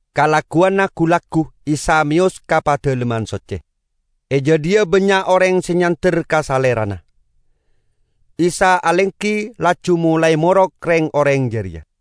Kalagguwanna gu-laggu Isa meyos ka Padalemman Socce. E jadhiya bannya' oreng se nyander ka Salerana. Isa alenggi, laju molae morok reng-oreng jareya.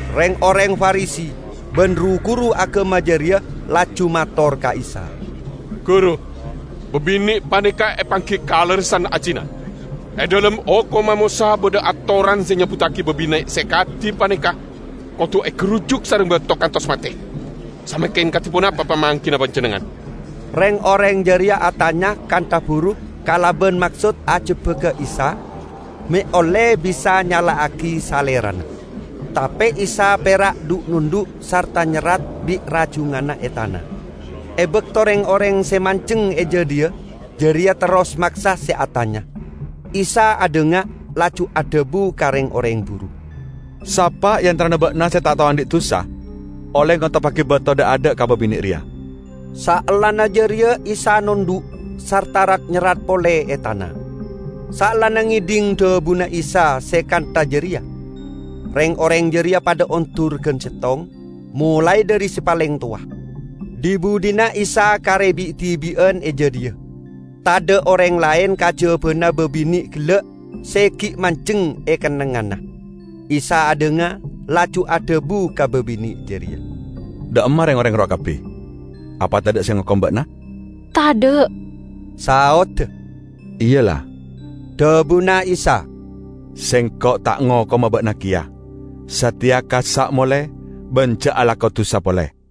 Reng-oreng Farisi ban ru-guru agama jareya laju mator ka Isa, "Guru, babine' paneka epanggi kalerressan azina. E dhalem Hokomma Mosa badha atoran se nyebbuttagi babine' se kadi paneka kodu egarujuk sareng bato kantos mate. Samangken kadi ponapa pamanggina Panjennengngan?" Reng-oreng jareya atanya kantha buru kalaban maksod ajebbaga Isa, me' olle bisa nyala'agi Salerana. Tape Isa pera' dhu'-nondhu', sarta nyerrat bi' rajunganna e tana. E bakto reng-oreng se manjeng e jadhiya jareya terros maksa se atanya, Isa adhanga laju adhabu ka reng-oreng buru, "Sapa e antarana ba'na se ta' tao andhi' dusa, olle ngoteppagi bato dha'-adha' ka babine' reya." Saellana jareya Isa nondhu' sarta rat-nyerrat pole e tana. Saellana ngedhing dhabuna Isa se kantha jareya, reng-oreng jareya padha ondur gan settong, molae dhari se paleng towa. Dhi-budhina Isa kare bi'-dibi'an e jadhiya; tadha' oreng laen kajabana babine' gella' se gi' manjeng e kennengnganna. Isa adhanga, laju adhabu ka babine' jareya, "Dha' emma reng-oreng rowa kabbi? Apa tadha' se ngokom ba'na?" "Tadha'," saodda. "Iya ella," dhabuna Isa, "Sengko' ta' ngokoma ba'na keya. Sateya kassa' mole, ban ja' alako dusa pole!"]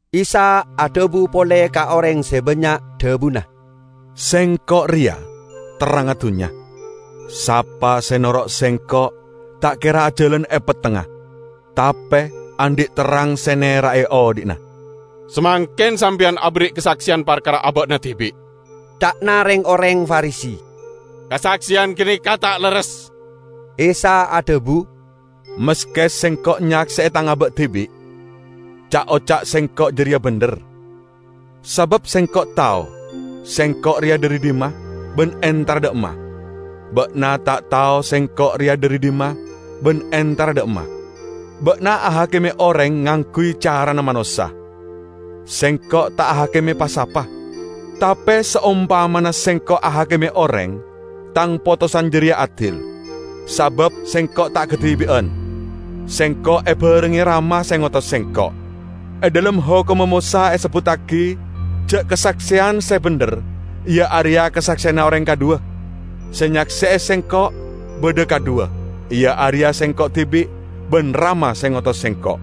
Isa adhabu pole ka oreng se bannya', dhabuna, "Sengko' reya terrangnga dunnya. Sapa se noro' Sengko' ta' kera ajalan e pettengnga, tape andhi' terrang se nera'e odhi'na." "Samangken Sampeyan aberri' kasakseyan parkara aba'na dibi'," ca'na reng-oreng Farisi; "kasakseyan ganeka ta' lerres." Isa adhabu, "Maske Sengko' nyakse'e Tang aba' dibi', ca'-oca' Sengko' jareya bendher, sabab Sengko' tao Sengko' reya dhari dhimma ban entara dha' emma. Ba'na ta' tao Sengko' reya dhari dhimma ban entara dha' emma. Ba'na ahakime oreng ngangguy carana manossa; Sengko' ta' ahakime pa-sapa. Tape saompamana Sengko' ahakime oreng, Tang potosan jareya adil, sabab Sengko' ta' kadibi'an; Sengko' ebarengnge Rama se ngotos Sengko'. E dhalem Hokomma Mosa esebbuttagi ja' kasakseyan se bendher iya areya kasakseyanna oreng kadhuwa. Se nyakse'e Sengko' badha kadhuwa iya areya Sengko' dibi' ban Rama se ngotos Sengko'."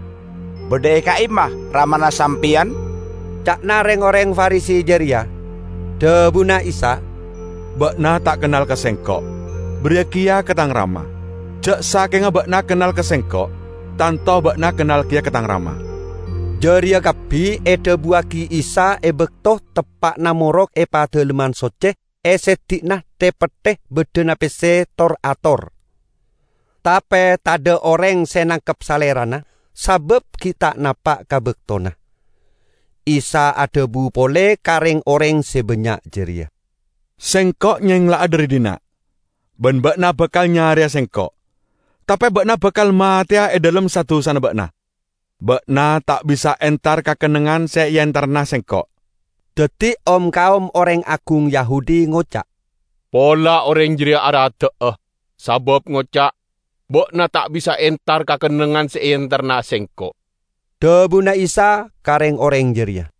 "Badha e ka'imma Ramana Sampeyan?" ca'na reng-oreng Farisi jareya. Dhabuna Isa, "Ba'na ta' kennal ka Sengko', bariya keya ka Tang Rama. Ja' sakenga ba'na kennal ka Sengko', tanto ba'na kennal keya ka Tang Rama." Jareya kabbi edhabuwagi Isa e bakto teppa'na morok e Padalemman Socce e seddi'na the-petthe baddhana pesse tor-ator. Tape tadha' oreng se nangkep Salerana, sabab gi' ta' napa' ka baktona. Isa adhabu pole ka reng-oreng se bannya' jareya, "Sengko' nyengla'a, dhari dhinna', ban ba'na bakal nyareya Sengko', tape ba'na bakal mateya e dhalem sa-dusana ba'na. Ba'na ta' bisa entar ka kennengngan se eentarana Sengko'." Daddi om-kaom oreng agung Yahudi ngoca', "Pola oreng jareya aradda'a, sabab ngoca', 'Ba'na ta' bisa entar ka kennengngan se eentarana Sengko'.' " Dhabuna Isa ka reng-oreng jareya,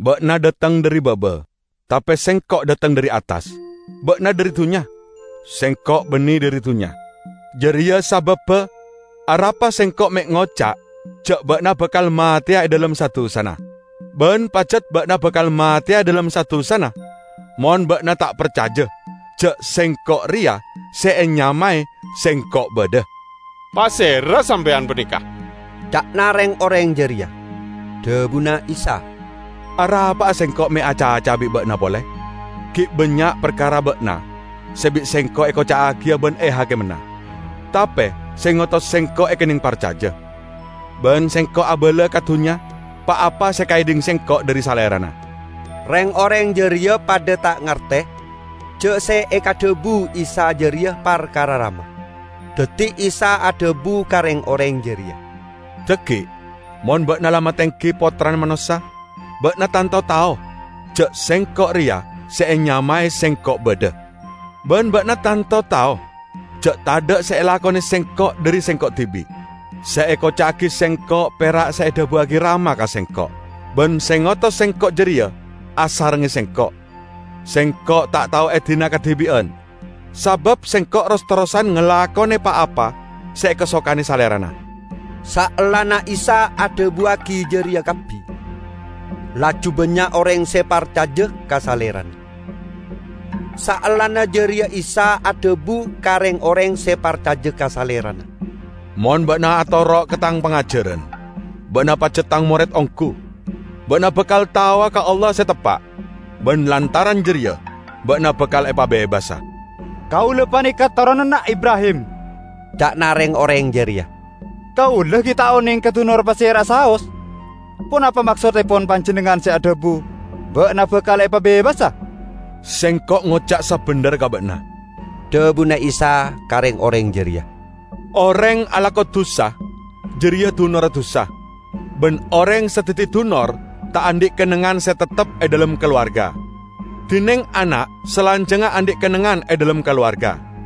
"Ba'na dhateng dhari baba; tape Sengko' dhateng dhari attas. Ba'na dhari dunnya, Sengko' banne dhari dunnya. Jareya sababba arapa Sengko' me' ngoca' ja' ba'na bakal mateya e dhalem sa-dusana. Ban pajat ba'na bakal mateya e dhalem sa-dusana mon ba'na ta' parcaja ja', 'Sengko' reya se enyamae SENGKO' BADHA'." "Pasera Sampeyan paneka?" ca'na reng-oreng jareya. Dhabuna Isa, "Arapa'a Sengko' me' acaca'a bi' ba'na pole! Gi' bannya' parkara ba'na se bi' Sengko' ekoca'agiya ban ehakimana. Tape se ngotos Sengko' ekenneng parcaja. Ban Sengko' abala ka dunnya pa-apa se ekaedhing Sengko' dhari Salerana." Reng-oreng jareya padha ta' ngarte ja' se ekadhabu Isa jareya parkara Rama. Daddi Isa adhabu ka reng-oreng jareya, "Dhaggi' mon ba'na la matenggi Pottrana Manossa, ba'na tanto tao ja', 'Sengko' reya se enyamae SENGKO' BADHA'. Ban ba'na tanto tao ja' tadha' se elakone Sengko' dhari Sengko' dibi'. Se ekoca'agi Sengko' pera' se edhabuwagi Rama ka Sengko'. Ban se ngotos Sengko' jareya asarengnge Sengko'. Sengko' ta' tao edina kadibi'an, sabab Sengko' ros-terrosan ngalakone pa-apa se ekasokane Salerana." Saellana Isa adhabuwagi jareya kabbi, laju bannya' oreng se parcaja ka Salerana. Saellana jareya Isa adhabu ka reng-oreng se parcaja ka Salerana, "Mon ba'na atoro' ka Tang pangajaran, ba'na pajat Tang mored onggu, ba'na bakal taowa ka Allah se teppa', ban lantaran jareya ba'na bakal epabebasa." "Kaula paneka toronanna Ibrahim," ca'na reng-oreng jareya. "Kaula gi' ta' oneng ekadunor pasera'a saos! Ponapa maksottepon Panjennengngan se adhabu, 'Ba'na bakal epabebasa?' " "Sengko' ngoca' sabendherra ka ba'na," dhabuna Isa ka reng-oreng jareya. "Oreng alako dusa, jareya dunorra dusa. Ban oreng se daddi dunor ta' andhi' kennengngan se teptep e dhalem kalowarga, dineng ana' salanjangnga andhi' kennengngan e dhalem kalowarga.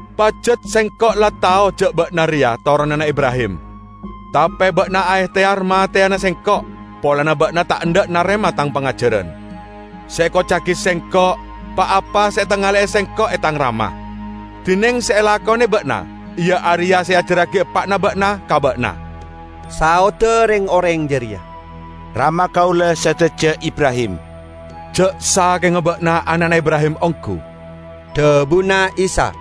Pajat Sengko' la tao ja' ba'na reya toronanna Ibrahim. Tape ba'na aehteyar mateyana Sengko' polana ba'na ta' endha' narema Tang pangajaran. Se ekoca'agi Sengko' pa-apa se etangale'e Sengko' e Tang Rama. Dineng se elakone ba'na iya areya se eajarragi eppa'na ba'na ka ba'na." Saodda reng-oreng jareya, "Rama kaula sadaja Ibrahim." "Ja' sakenga ba'na ana'na Ibrahim onggu," dhabuna Isa,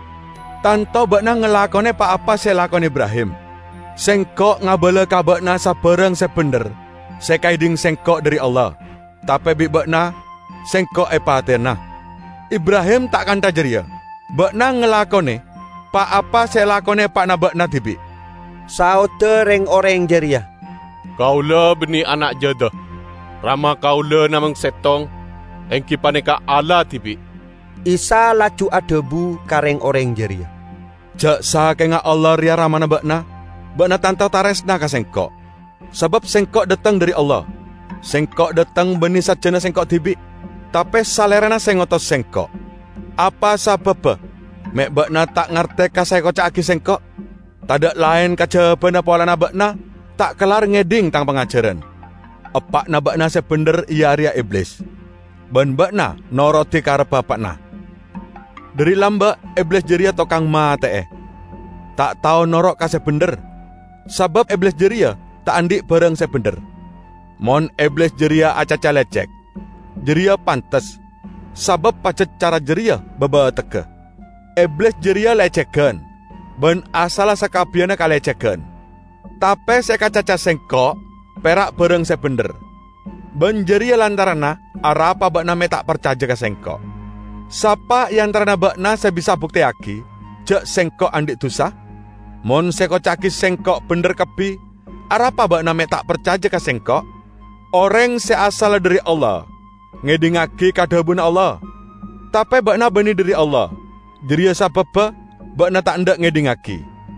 "tanto ba'na ngalakone pa-apa se elakone Ibrahim. Sengko' ngabala ka ba'na sabarang se bendher se ekaedhing Sengko' dhari Allah, tape bi' ba'na Sengko' epateyana. Ibrahim ta' kantha jareya! Ba'na ngalakone pa-apa se elakone eppa'na ba'na dibi'." Saodda reng-oreng jareya, "Kaula banne ana' jada. Rama kaula namong settong, enggi paneka Allah dibi'." Isa laju adhabu ka reng-oreng jareya, "Ja' sakenga Allah reya Ramana ba'na, ba'na tanto taresna ka Sengko', sabab Sengko' dhateng dhari Allah. Sengko' dhateng banne sajjana Sengko' dibi', tape Salerana se ngotos Sengko'. Apa sababba me' ba'na ta' ngarte ka se ekoca'agi Sengko'? Tadha' laen kajabana polana ba'na ta' kellar ngedhing Tang pangajaran. Eppa'na ba'na se bendher iya areya Iblis, ban ba'na norodi karebba eppa'na. Dhari lamba' Iblis jareya tokang mate'e, ta' tao noro' ka se bendher, sabab Iblis jareya ta' andhi' barang se bendher. Mon Iblis jareya acaca lecek, jareya pantes, sabab pajat cara jareya babategga. Iblis jareya lecegan, ban asalla sakabbiyanna kalecegan. Tape se ekacaca Sengko' pera' barang se bendher, ban jareya lantaranna arapa ba'na me' ta' parcaja ka Sengko'. Sapa e antarana ba'na se bisa abukteyagi ja' Sengko' andhi' dusa? Mon se ekoca'agi Sengko' bendher kabbi, arapa ba'na me' ta' parcaja ka Sengko'? Oreng se asalla dhari Allah, ngedhingngagi ka dhabuna Allah. Tape ba'na banne dhari Allah, jareya sababba ba'na ta' endha' ngedhingngagi."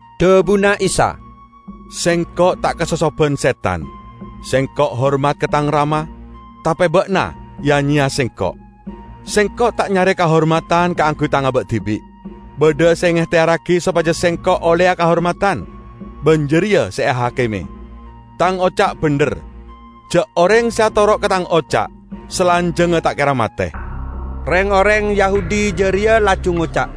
Dhabuna Isa, "Sengko' ta' kasosoban setan. Sengko' hormat ka Tang Rama, tape ba'na ya-nyeya Sengko'. Sengko' ta' nyare kahormadan kaangguy Tang aba' dibi'. Badha se ngehteyarragi sopaja Sengko' olleya kahormadan, ban jareya se ahakime. Tang oca' bendher, ja' oreng se atoro' ka Tang oca' salanjangnga ta' kera mate." Reng-oreng Yahudi jareya laju ngoca',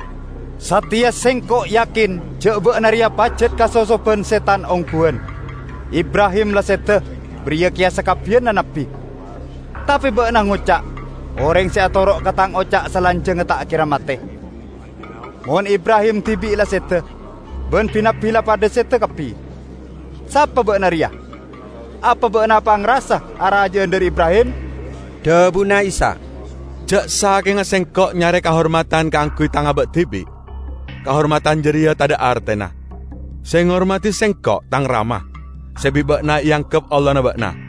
"Sateya sengko' yakin ja' ba'na reya pajat kasosoban setan ongguwan! Ibrahim la seda, bariya keya sakabbiyanna nabbi. Tape ba'na ngoca', 'Oreng se atoro' ka Tang oca' salanjangnga ta' kera mate.' Mon Ibrahim dibi' la seda, ban bi-nabbi la padha seda kabbi, sapa ba'na reya? Apa ba'na apangrasa araja'an dhari Ibrahim?" Dhabuna Isa, "Ja' sakenga Sengko' nyare kahormadan kaangguy Tang aba' dibi', kahormadan jareya tadha' artena. Se ngormadi Sengko' Tang Rama, se bi' ba'na eanggep Allahna ba'na,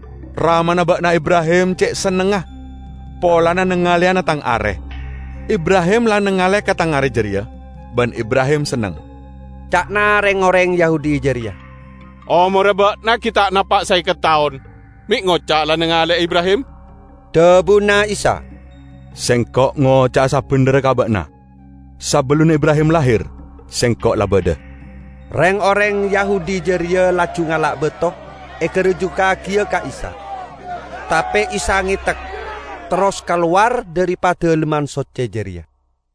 Ramana ba'na Ibrahim ce' sennengnga polana nangaleyana Tang are. Ibrahim la nangale ka Tang are jareya, ban Ibrahim senneng." Ca'na reng-oreng Yahudi jareya, "Omorra ba'na gi' ta' napa' saeket taon, me' ngoca' la nangale'e Ibrahim?" Dhabuna Isa, "Sengko' ngoca'a sabendherra ka ba'na: Sabellunna Ibrahim lahir, Sengko' la badha." Reng-oreng Yahudi jareya laju ngala' bato egarujukkagiya ka Isa, tape Isa ngetek, terros kalowar dhari Padalemman Socce jareya.